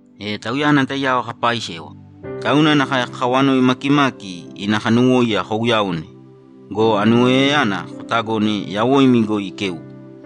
E Tauyana taiyao kaapaisewa, tauna nakae kakawanoi makimaki ina kanuwóiya kouyaōne go, anuwoiyayana kotagōne yawoimi goi ikeuwoe.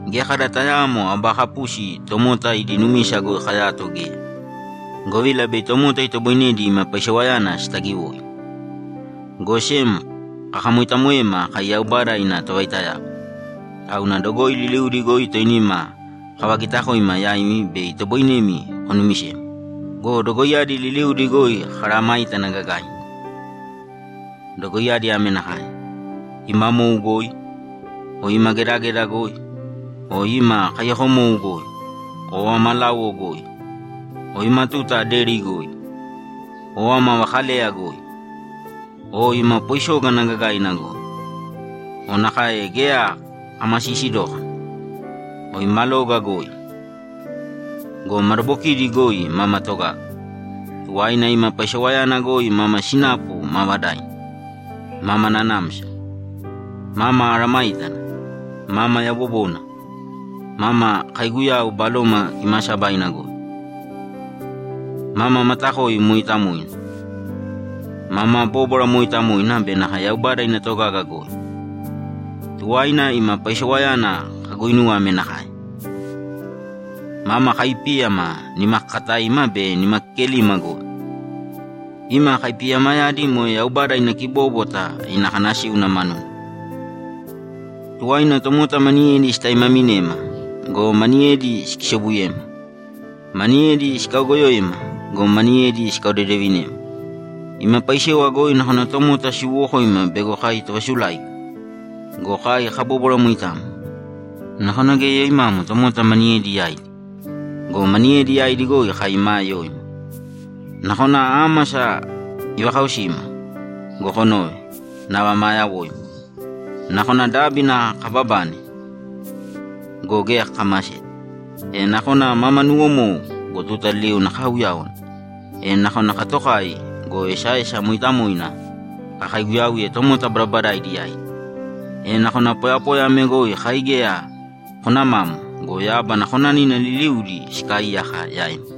Geya kada tayaamo aba kapusi tomota idi numisa goi kayato geya, govila bei tomota itoboinedi ima paisewayana sitagiwoi. Go sem kakamoitamoema kai Yaubada ina tovaitayao, tauna dogoi liliudi goi toinima kavagitakoima yaimi be itoboinemi konumisema go, dogoiyadi liliudi goi kamesayágana gagaina. Dogoiyadi ame nakae: Ima mou goi, o ima gedageda goi, o ima kaiyakomou goi, o ama láuwo goi, o ima tuta deri goi, o ama vakaleya goi, o ima poisógana gagaina goi, o nakae geya kamasiisi dókana, o ima loga goi. Go madabokidi goi mama togaga. Tuwaina ima paisewayana goi mama sinapu maavadaina, mama nanamsa, mama mesayágana, mama yabobona, mama kaiguyau, Baloma Kimaasabaina goi, mama matakoi mooitamoina, mama bóbwara mooitamoina be nakae Yaubada ina togaga goi. Tuwaina ima paisewayana kaguinuwe ame nakae: Mama kaipíyama nimakakataima be nimakekelima goi. Ima kaipiyamayadi moe Yaubada ina kibóbwata ina kanasíuna manuna. Tuwaina tomota maniyedi sitaimaminema go, maniyedi sikisobuyema. Maniyedi sikaogoyoema go, maniyedi sikaodedevinema. Ima paisewa goi nakona tomota siwowokoima bego kai tovasuláiga go, kai kabóbwara moitamo. Nakona geya yoimamo tomota maniyedi yaidi go, maniyedi yaidi kai maa yoima. Nakona ámasa ivakaosima go, konove, nava maa yawoima. Nakona dábina kababane go, geya kakamaseta. E nakona mama nuwomou go, tuta liliuna kaauyáwana. E nakona katokai go, esaesa mooitamoina kakaiguyauye tomota badabadaidi yaidi. E nakona poyapoya ame goi kai geya konamamo go, yábana konanina liliudi sikaaiyaka yaima.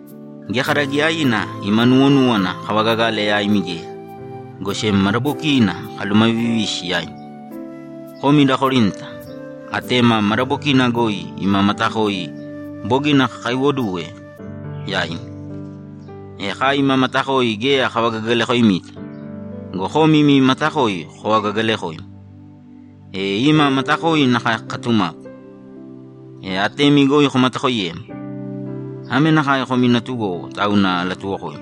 Geya kada giyaiina ima nuwonúwana kavagagale yaimi geya, go sem madabokiina kalumavivisi yaimi! Komi da Korinta, atema madabokina goi ima matakoi bogina kakaiwoduwe yaimi! E kai ima matakoi geya kavagagalakoimita go, komi imi matakoi kovagagaalekoima. E ima matakoi nakae kokatumāpu, e atemi goi komatakoiyēma. Ame nakae komi natugowo, tauna alatuwokoimi.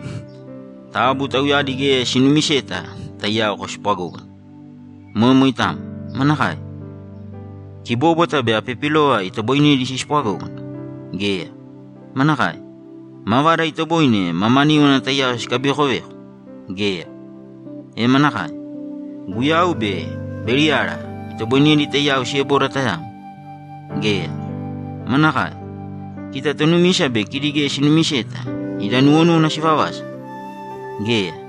Taabu tauyadi geya sinuumiseta taiyao koospwagōgana. Moe moitamo. Manakae? Kibóbwata be apipilova itoboinedi sispwagógana? Geya. Manakae? Mavada itoboine mamaníwana taiyao sikabivekoveko? Geya. E manakae? Guyau be Beliyala itoboinedi taiyao sieboda tayamo? Geya. Manakae? Kita tonumisa be kidi geya sinumiseta ida nuwonúwana sivavasa? Geya.